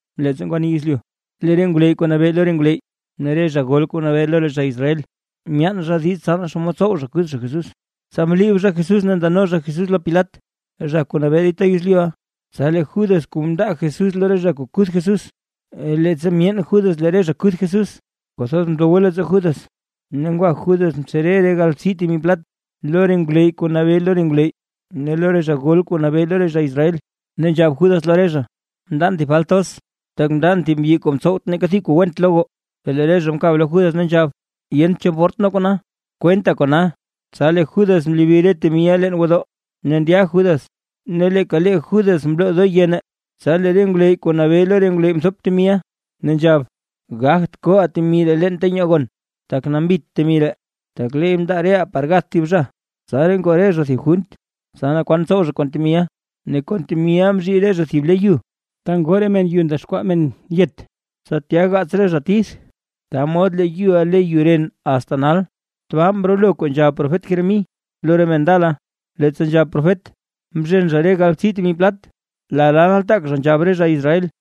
Leettsa ngwani yezlyu, lee re ngwleyy kuu nabee lo re ngwleyy ne re zha gol kuu nabee lo re zha Israel, myaan zha diiz tsa naa xomod tsow zha kuth zha Jesús. Tsa mliib zha Jesús ne ndano zha Jesús lo Pilat, zha kuu nabee dita yezlyuʼa. Tsa lee Judas kuu mndaa Jesús lo re zha kuu kuth Jesús, leettsa myeen Judas lee re zha kuth Jesús, kwathoz ndowe leettsoo Judas, ne ngwa Judas mtsere re galbtsii temi plat, lo re ngwleyy kuu nabee lo re ngwleyy ne lo re zha gol kuu nabee lo re zha Israel. Ne nzhab Judas lo re zha: ―Mndan thib falt thoz, tak mndan thib zha kuu mtsowt neeka thib kuu went gath. Per lee re zha mkab lo Judas ne nzhab: ―¿Yent cho mport nee kona? ¡Kwenta kona! Tsa lee Judas mlobi re temiʼa leen gwodoo, ne ndya Judas ne leeka lee Judas mloo doo yene. Tsa lee re ngwleyy kuu nabee lo re ngwleyy mthop temiʼa, ne nzhab: ―Gagt koʼaa temi ree leen ta nyoo gon, tak nambit temi ree, tak leey mndaa reʼaa par gath thib zha. Tsaraa ngoo re zha thib junt, tsa naa kwan tsow zha kon temiʼa, ne kon temiʼa mzhii re zha thib le yu, ta ngoo re men yu ndexkwaa men yet, tsa tya gaats re zha tith. Ta mod lee yuʼa le Yu Ren asta nal. Tbaa mrolo kuu nzhab profet Jeremí lo re men ndala, leettsa nzhab profet: “Mzhen zha re galbtsii temi plat, lala nataak zha nzhab re zha Israel.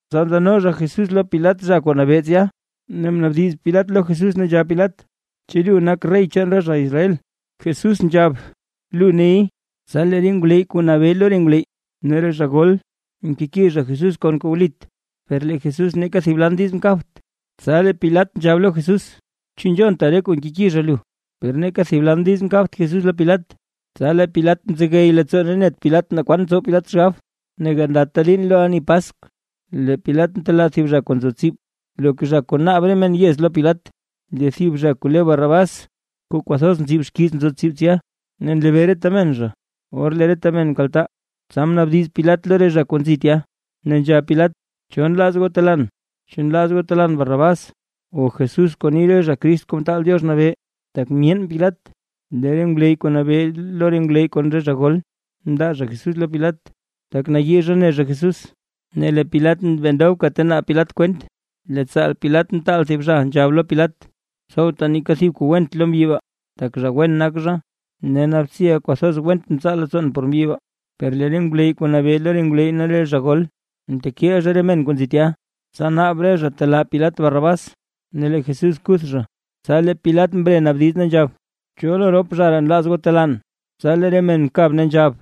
Tsa ndano zha Jesús lo Pilat zha kuu nabee tsya. Ne mnaabdiz Pilat lo Jesús ne nzhab Pilat: ―¿Chu lu nak rey chaan re zha Israel? Jesús nzhab: ―Lu ney. Tsa lee re ngwleyy kuu nabee lo re ngwleyy ne re zha gol, mkeki zha Jesús kon kuu wlit, per lee Jesús neeka thib lan diiz mkabt. Tsa lee Pilat nzhab lo Jesús: ―¿Chu nzhonta re kuu nkeki zha lu? Per neeka thib lan diiz mkabt Jesús lo Pilat, tsa lee Pilat mzegey leettsoo ne net Pilat naa kwan tsow Pilat xgab. Ne gandata liin lo ani Paskw, lee Pilat ntelaa thib zha kuu nzo tsib, loka zha kuu naab re men yez lo Pilat. Lee thib zha kuu le Barrabás kuu kwathoz nzib xkiiz nzo tsib tsya, ne nlebee reta men zha. Or lee reta zha mkaltaa, tsa mnaabdiz Pilat lo re zha kuu nzi tya, ne nzhab Pilat: ―¿Cho nlaaz goo telaan? ¿Chu nlaaz goo telaan Barrabás, o Jesús kuu ni re zha, Crist Kuu Mtaal Diox Nabee? Tak myeen Pilat lee re ngwleyy kuu nabee lo re ngwleyy kon re zha gol, mndaa zha Jesús lo Pilat, tak nayii zha ne zha Jesús. Ne lee Pilat bee ndobka ta naab Pilat kwent, lee tsaal Pilat mtaal thib zha, nzhab lo Pilat: ―Tsowta neeka thib kuu went lo mbyi baa, tak zha wen nak zha. Ne naabtsiʼa kwathoz went mtsaa leettsoon por mbyi baa. Per lee re ngwleyy kuu nabee lo re ngwleyy ne re zha gol, mtekiil zha re men kuu nzi tya, tsa naab re zha telaa Pilat Barrabás ne lee Jesús kuth zha. Tsa lee Pilat mre mnaabdiz, ne nzhab: ―¿Cho lo rop zha ree nlaaz goo telaan? Tsa lee re men mkab ne nzhab: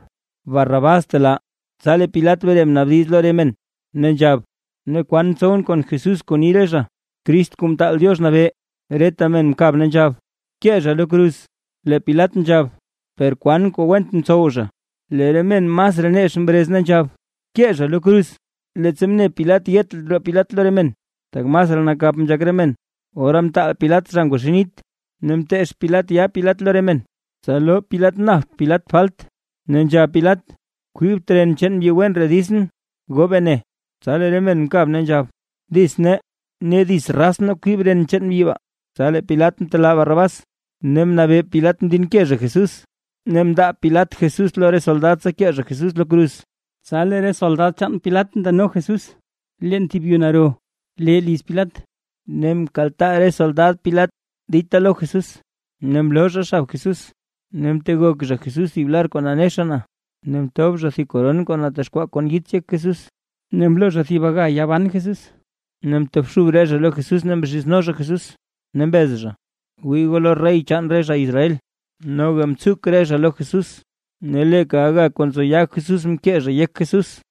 ―Barrabás btelaa. Tsa lee Pilat mre mnaabdiz lo re men, ne nzhab: ―Ne, ¿kwan tsowʼn kon Jesús kuu ni re zha, Crist Kuu Mtaal Diox Nabee? Reta men mkab ne nzhab: ―¡Bkee zha lo kruz! Lee Pilat nzhab: ―Per, ¿kwan kuu went mtsow zha? Lee re men masraa nex mrez, ne nzhab: ―¡Bkee goo zha lo kruz! Leettsa mne Pilat yet roo Pilat lo re men, tak masraa nakap nzhak re men, ora mtaal Pilat zha ngwaxii nit, ne mteech Pilat yaa Pilat lo re men, tsa loo Pilat napt Pilat falt, ne nzhab Pilat: ―Kwibt ren chaan mbyi wen ree ditsʼn, goo bene. Tsa lee re men mkab ne nzhab: ―¡Dits nee, ne dits raz nee kwib ren chaan mbyi baa! Tsa lee Pilat mtelaa Barrabás, ne mnabee Pilat mdinke zha Jesús, ne mndaa Pilat Jesús lo re soldad tsa kee zha Jesús lo kruz. Tsa lee re soldad chaan Pilat ndano Jesús leen thib yuu naro lee liz Pilat, ne mkaltaa re soldad Pilat dita lo Jesús. Ne mloo zha xabits Jesús ne mtegok zha Jesús thib lar kuu nanexa na. Ne mtob zha thib koron kuu natexkwaa kon yits yek Jesús, ne mloo zha thib aga yaa ban Jesús. Ne mtobxub re zha lo Jesús ne mzhizno zha Jesús, ne mbez zha: ―¡Wii goo lo rey chaan re zha Israel! Noga mtsuk re zha lo Jesús, ne leeka aga kuu nzo yaa Jesús mkee zha yek Jesús.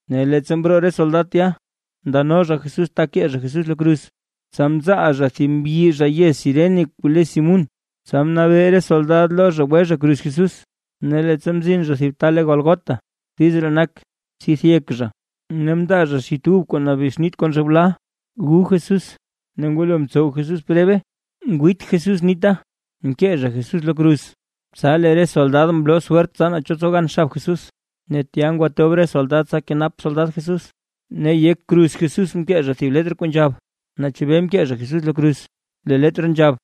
Ne leettsa mroo re soldad tya, ndano zha Jesús ta kee zha Jesús lo kruz, tsa mzaal zha thib mbyi zha yez Cirene kuu le Simún. Tsa mnabee re soldad lo zha gwe zha kruz Jesús. Ne leettsa mzin zha thib ta le Gólgota. (Diiz ree nak: “Tsidth yek zha”.) Ne mndaa zha xit ub kuu nabexnit kon zhewla gu Jesús; ne ngwalo mtsow Jesús prebe, ngwiit Jesús nita. Mkee zha Jesús lo kruz, tsa lee re soldad mloo swert tsa naa cho tsow gan xab Jesús. Ne tya mndob re soldad tsa kenap soldad Jesús. Ne yek kruz Jesús mkee zha thib letr kuu nzhab naa chebee mkee zha Jesús lo kruz. Lee Letr nzhab: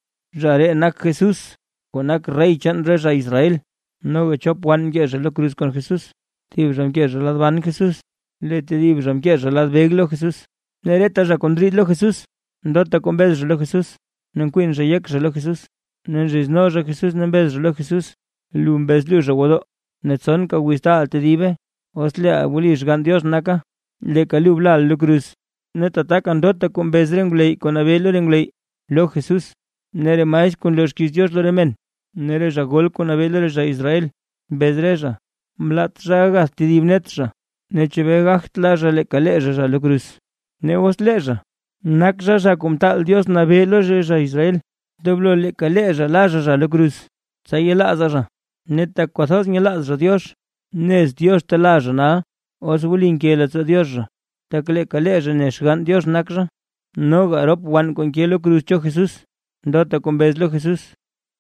“ZHA REE NAK JESÚS KUU NAK REY CHAAN RE ZHA ISRAEL”. Noga chop wann mke lo kruz kon Jesús, thib zha mke lad ban Jesús, lee tedib zha mke lad beg lo Jesús. Ne reta zha kuu ndriid lo Jesús, ndota kuu mbez zha lo Jesús, ne nkwin zha yek zha lo Jesús. Ne nzhizno zha Jesús ne mbez zha lo Jesús: ―Lu mbez luuzha gwodoo, ne tsonka wiz taaʼa tedibe. ¡Os leeʼa wli Xgann Diox naka, leeka lu blaʼa lo kruz! Ne tataka ndota kuu mbez re ngwleyy, kuu nabee lo re ngwleyy lo Jesús ne re maestr kuu nloo xkiiz Diox lo re men ne re zha gol kuu nabee lo re zha Israel, mbez re zha: ―Mlaat zha gagath tedib net zha, ¿ne chebee gagt la zha leeka lee zha zha lo kruz? Ne os lee zha nak zha, Zha Kuu Mtaal Diox Nabee lo re zha Israel, ndoblo leeka lee zha la zha zha lo kruz, tsa yelaazaa zha. Ne tak kwathoz nyelaaz zha Diox, nez Diox telaa zha nal, os wli nke leettsoo Diox zha; tak leeka zha ne Xgann Diox nak zha. Noga rop wann kuu nke lo kruz cho Jesús, ndota kuu mbez lo Jesús.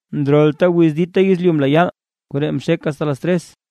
Ndrolta wiz dita yezlyu mla yaal, koree mxek asta las tres.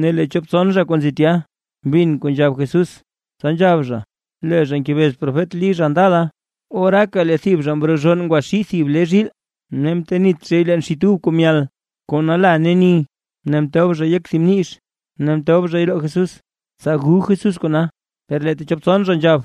Ne lee chop tson zha kuu nzi tya, mbin kuu nzhab Jesús, tsa nzhab zha: ―Lee zha ngebez profet Lí zha ndala. Oraaka lee thib zha mrozhonn ngwaxii thib le zhiil, ne mtenit zhay leen xit ub kuu myal kuu nala ne ni, ne mtob zhay yek thib mnix, ne mtob zhay roo Jesús, tsa gu Jesús kona. Per lee techop tson zha nzhab: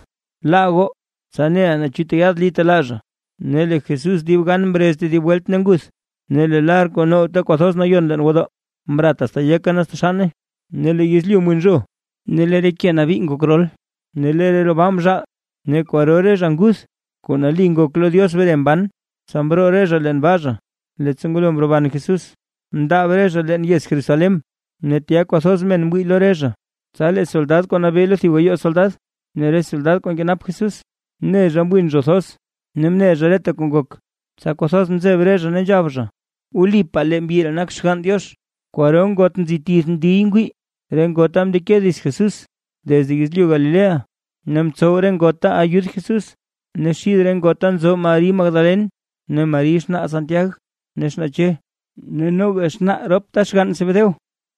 ―Laa goo, tsa neʼaa naa chu tyaad Lí telaa zha. Ne lee Jesús dib gan mrez tedib welt ne nguth. Ne lee lar kuu ntow, Ta Kwathoz Nayon leen gwodoo, mrat asta yeke ne asta xanne. Ne lee yezlyu mwin zho, ne lee re ke nabii ngok rol. Ne lee re roo baa mzhaal; ne kwaro re zha nguth kuu nali ngok lo Diox mre mban. Tsa mroo re zha leen baa, leettsa ngulo mroban Jesús, mndaab re zha leen yez Jerusalén, ne tya kwathoz men mwii lo re zha. Tsa lee soldad kuu nabee lo thib gayoo soldad ne re soldad kuu nkenap Jesús, mne zha mwin zho thoz ne mne zha reta kuu ngok, tsa kwathoz mzeb re zha ne nzhab zha: ―Wlipaa, lee mbyi ree nak Xgann Diox. Kwaro ngot nzi tith ndiy ngwii, re ngota mndeke dits Jesús desde yezlyu Galilea ne mtsow re ngota ayud Jesús. Ne xid re ngota nzo Mari Magdalen, ne Mari xnaa Santiag ne xnaa Che, ne noga xnaa ropta xgann Zebedeo.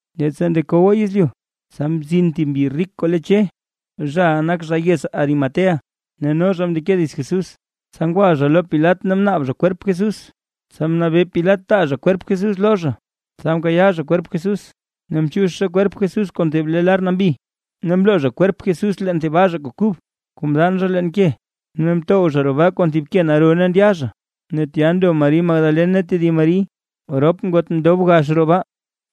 Leettsa ndekowa yezlyu, tsa mzin thib mbyi rik kuu le Che, zhaʼa nak zha yez Arimatea ne no zha mndeke dits Jesús. Tsa ngwa zha lo Pilat ne mnaab zha kwerp Jesús. Tsa mnabee Pilat taa zha kwerp Jesús lo zha. Tsa mkayaa zha kwerp Jesús, ne mchiix zha kwerp Jesús kon thib le lar nambi. Ne mloo zha kwerp Jesús leen thib baa zha, kuu kub kuu mdaan zha leen ke. Ne mtow zha roo baa kon thib ke naro ne ndya zha. Ne tya ndo Mari Magdalen ne tedib Mari, rop ngot ndob gax roo baa.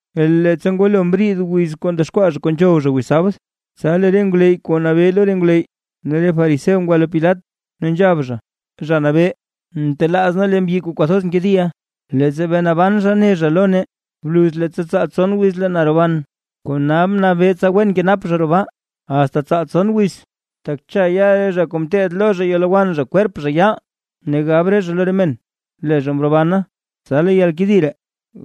Ne leettsa ngwalo mriid wiz kuu ndexkwaa zha kuu nzhow zha wiz sabd, tsa lee re ngwleyy kuu nabee lo re ngwleyy ne re fariseo ngwa lo Pilat, ne nzhab zha: ―Zha nabee, mtelaaz nee lee mbyi kuu kwathoz mkediʼa, leettsa bee naban zha ne zha lo nee: “Bluz leettsa tsaal tson wiz lee na roban”. Kona bnabee tsa wen kenap zha roo baa, asta tsaal tson wiz. Tak cha ya re zha kuu mteed lo zha yalowann kwerp zha yaal, ne gab re zha lo re men: “Lee zha mrobana”. Tsa lee yalkedi ree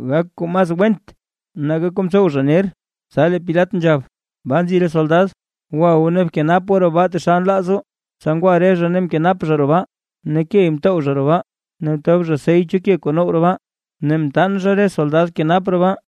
gak kuu masraa went nake kuu mtsow zha ner. Tsa lee Pilat nzhab: ―Baa nzi re soldad, gwa goo ne bkenap goo roo baa taxal nlaaz goo. Tsa ngwa re zha ne mkenap zha roo baa, ne key mtow zha roo baa, ne mtob zha sey cho ke kuu now roo baa, ne mtaan zha re soldad kenap roo baa.